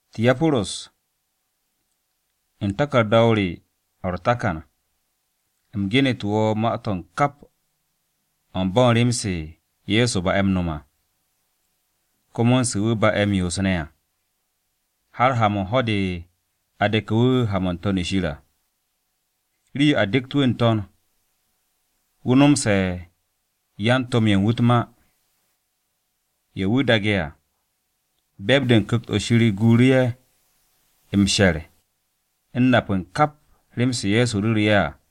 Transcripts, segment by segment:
Tiyaporus, u̱n taku̱rda-o re o̱ u̱r-takan, u̱m genu̱tu̱ wo̱ ma-to̱ u̱n kap o̱ u̱n bo̱ u̱n rem-se Ye̱so ba'e̱ m-no̱m à, komo u̱n se wu̱ ba'e̱ m-yoos ne̱ à, har ha-mo̱ u̱n ho̱-de a de̱ke̱ wu̱ ha-mo̱ n-To̱n shir à. Rii-yo a dekt wu̱ n-To̱n, wu̱ nomsu̱te̱ yan-To̱m-ye̱ u̱n wu̱ u̱t-ma, ye̱ wu̱ daage̱ à. Be̱e̱b-de u̱n Ku̱kt-o̱ Shir guuru̱ ye̱ m-she̱r u̱n nap u̱n ká rem-se Ye̱so ru̱ru̱ ye̱ à.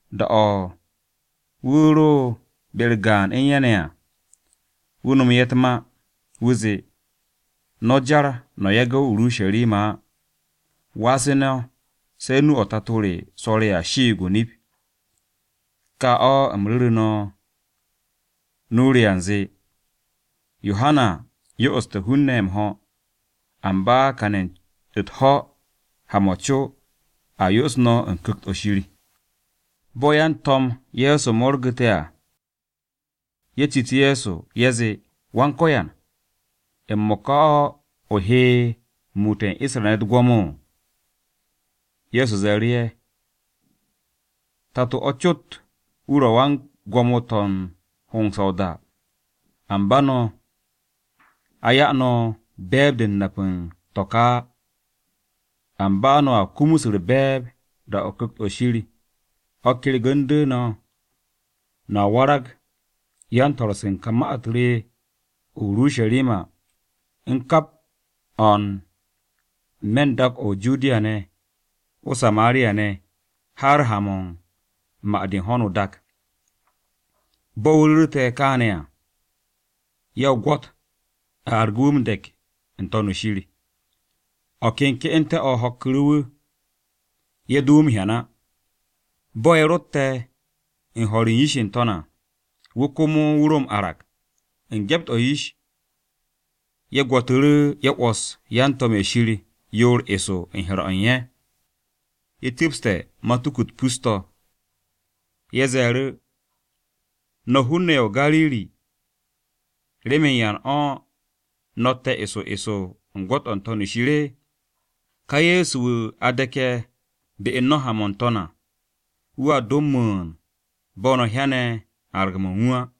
Da-o̱ wu̱ ro be-u̱r gaan u̱n ye̱ ne̱ à, wu̱ nomo ye̱ u̱t-ma. Wu̱ zee, “No̱ jar no̱ yage̱ o-Urusharima á. Wasu̱ no̱ se̱ nu-o̱ Tato re swo̱re̱ à shiig o-nip, ká o̱ u̱m ru̱ru̱ no̱ u̱n nu-o re à, u̱nze, Yohana yo'oste̱ hun-ne̱ m-ho̱, amba kane̱ u̱t-ho̱ ha-mo̱ co, a yo'os no̱ u̱n Ku̱kt-o̱ Shir.” Bo̱ yan-To̱m Ye̱so mo̱rgu̱te̱ à, ye̱ citu̱ Ye̱so. Ye̱ zee, “Wan-Ko̱yan, ¿m-mo̱ka o̱ o he muute̱ u̱n Isra-ne̱ u̱t-gwo̱mo?” Ye̱so ze̱e̱ru̱ ye̱, “Tato-o̱ cot wu̱ ro̱ wan-gwo̱mo to̱ u̱n hongse̱ o-da, amba no̱ a 'ya no̱ be̱e̱b-de u̱n nap u̱n to̱ ka á. Amba no̱a kumus u̱r-be̱e̱b da-o̱ Ku̱kt-o̱ Shir o̱ kyergu̱ndu̱ no̱. No̱a warag yan-swo̱-se u̱n ma-u̱t re o-Urusharima, u̱n kap o̱ n-me̱ u̱n dak-o̱ o-Judiya ne̱, o-Samariya ne̱, har ha-mo̱ u̱n ma-de u̱n ho̱no o-dak.” Bo̱ wu̱ ru̱rte̱ kaane̱ à, ye̱ o-gwo̱t, a argu̱ wu̱ m-de̱k n-To̱n shir. O̱ ken ke'ente̱-o̱ ho̱kku̱ru̱ wu̱. Ye̱ do wu̱ m-hyan á. Bo̱ ye̱ rotte̱ u̱n ho̱r u̱n yish n-to̱n à, wu̱ komo wu̱ ro m-arag, u̱n gyept-o̱ yish. Ye̱ gwo̱tu̱ru̱ ye̱ 'wo̱s yan-to̱m-ye̱ Shir yoor eso u̱n he̱r-o̱ u̱n ye̱, ye̱ cu̱pste̱ matuku-u̱t pus-to̱. Ye̱ ze̱e̱ru̱, “No̱ hun-ne̱ ye̱ o-Gariri, ¿remen yan o̱ no̱tte̱ eso eso u̱n gwo̱t-o̱ n-To̱n shir? Ká Ye̱so wu̱ a de̱ke̱ be u̱n no̱ ha-mo̱ n-To̱n à, wu̱a do m-mu̱u̱n bo̱ no̱ hyane̱ arag-mo̱ u̱n wu̱ à.”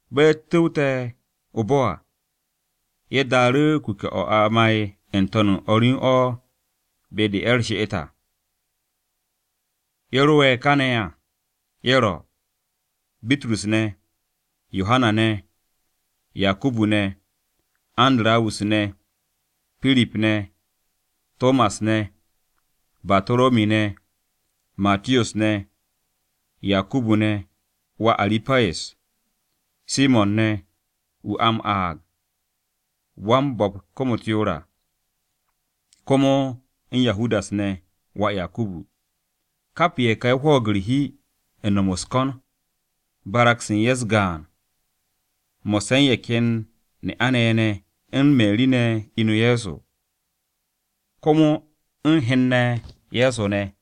Bo̱ ye̱ cu̱wte̱ o-bo̱ à, ye̱ daaru̱ kuke̱-o̱ a ma'e̱ n-to̱n u̱n o̱r u̱n o̱ be-de ye̱ u̱r-she'et à. Ye̱ ro'e̱ kane̱ à, ye̱ ro̱, Bitrus ne̱, Yohana ne̱, Yakubu ne̱, Andarawus ne̱, Pirip ne̱, Tomas ne̱, Bataromi ne̱, Matiyos ne̱, Yakubu ne̱ (wà Aru̱payes), Simo̱n ne̱ (wu̱ a m-aag ya'as u̱r-hi à), komo u̱n Yahudas ne̱ (wà Yakubu). Kap ye̱ ka ye̱ hwo̱o̱g u̱r-hi u̱n no̱m u̱s-ko̱n, barag-se u̱n ye̱ u̱s-gaan mo̱sse̱ u̱n ye̱ ken ne'a-ne̱ ye̱ ne̱, u̱n Meri ne̱ inu Ye̱so, komo u̱n hen-ne̱ Ye̱so ne̱.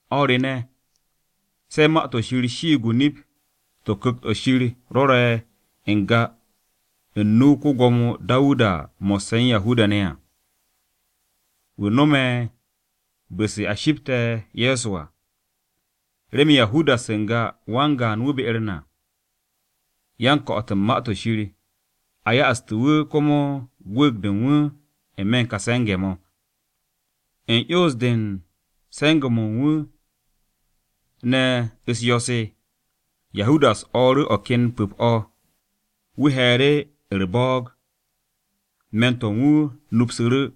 “O̱r re ne̱, se̱ Ma-to̱ Shir shiig o-nip to̱ Ku̱kt-o̱ Shir rwo̱re̱ n-ga u̱n nu-o ko-Gwo̱mo Dawuda mo̱sse̱ u̱n Yahudas ne̱ à, wu̱ hante̱ bu̱-se a shipte̱ Ye̱so à. Remen Yahudas n-ga wan-gaan wu̱ be-u̱r na yan-ko̱'o̱t u̱n Ma-to̱ Shir, a ya'assu̱tu̱ wu̱ komo gwu̱u̱g-de u̱n wu̱ n-me̱ u̱n ka se̱nge̱-mo̱.” (U̱n 'yons-de u̱n se̱nge̱-mo̱ u̱n wu̱ ne̱ m-yo̱ mo̱, Yahudas o̱o̱ru̱ o̱ ken pu̱p-o̱. Wu̱ he̱e̱ru̱ u̱r-bo̱o̱g, me̱n-o̱ u̱n wu̱ nupsu̱ru̱,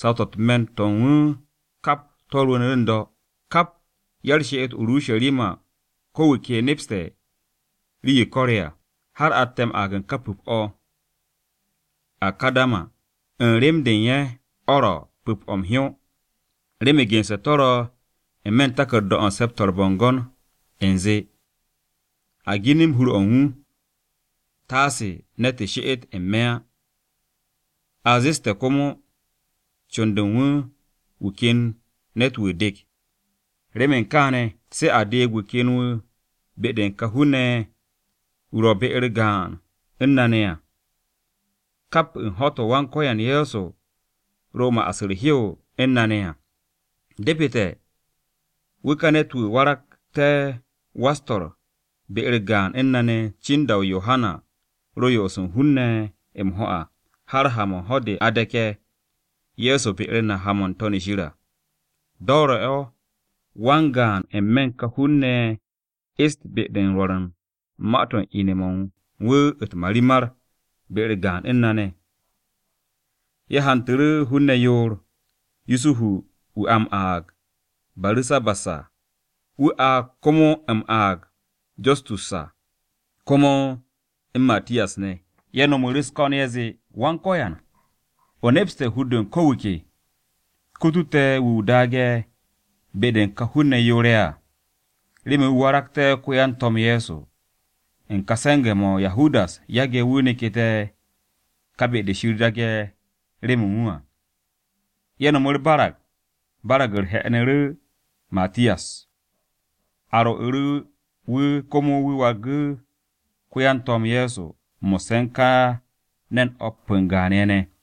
saw-to̱ u̱t-me̱n to̱ u̱n wu̱ kap to̱ rwu̱u̱nu̱ n-do̱. Kap ya-u̱r-she'et o-Urusharima ko wu̱ ke nepste̱ rii-yo ko̱re̱ à, har atte̱ m-aag u̱n ka pu̱p-o̱ “Akardama” u̱n rem-de u̱n ye̱, o̱ ro̱ Pu̱p-o̱ m-Hyó.) Bitrus ze̱e̱ru̱, “Remen gense̱ to̱ ro̱ n-me̱ u̱n taku̱rda-o̱ u̱n Se̱p-to̱ u̱r-Bo̱ngo̱n u̱nze, “ ‘A ginim hur-o̱ u̱n wu̱, taase ne̱tu̱ she'et n-me̱ á.’ A zeste̱ komo, ‘Con-de u̱n wu̱, wu̱ ken ne̱t-wu̱ dek.’ Remen kaane̱, se̱ a deeg wu̱ ken wu̱ be-de u̱n ka hun-ne̱ ye̱, wu̱ ro̱ be-u̱r gaan u̱n na ne̱ à, kap u̱n ho̱-to̱ Wan-Ko̱yan Ye̱so ro m-ma'as u̱r-hew u̱n na ne̱ à. Depete̱ wu̱ ka ne̱t-wu̱ warag wa-u̱s-swo̱ be-u̱r gaan u̱n na ne̱ cin da-o̱ Yohana ro m-yo'os u̱n Ye̱so m-ho̱ à har ha-mo̱ u̱n ho̱-de a de̱ke̱ Ye̱so be-u̱r na ha-mo̱ n-To̱n shir à. Do̱re̱-o̱ wan-gaan n-me̱ u̱n ka hun-ne̱ ye̱ est be-de u̱n rwo̱r u̱n ma-to̱ u̱n ine̱-mo̱ u̱n wu̱ u̱t-marimar be-u̱r gaan u̱n na ne̱.” Ye̱ hantu̱ru̱ hun-ne̱ yoor: Yusuhu wu̱ a m-aag Baru̱sabas à (wu̱ a komo m-aag Justus à), komo u̱n Matiyas ne̱. Ye̱ no̱mu̱ u̱s-ko̱n: Ye̱ zee, “Wan-Ko̱yan, o nepste̱ hur-de u̱n ko wu̱ ke. Kutu te̱ wu̱ o daage̱ be-de u̱n ka hun-ne̱ yoor-ye̱ à, remen wu̱ waragté̱ ko-yan-To̱m Ye̱so, u̱n ka se̱nge̱-mo̱ Yahudas yage̱ wu̱ neku̱te̱ ká be-de Shir daage̱ remen wu̱ à.” Ye̱ nom u̱r-barag. Barag-u̱r he̱'e̱nu̱ru̱ Matiyas. A rwo̱'u̱ wu̱ komo wu̱ wargu̱ ko-yan-To̱m Ye̱so mo̱sse̱ u̱n ka ne̱n o̱p o-gaan ye̱ ne̱.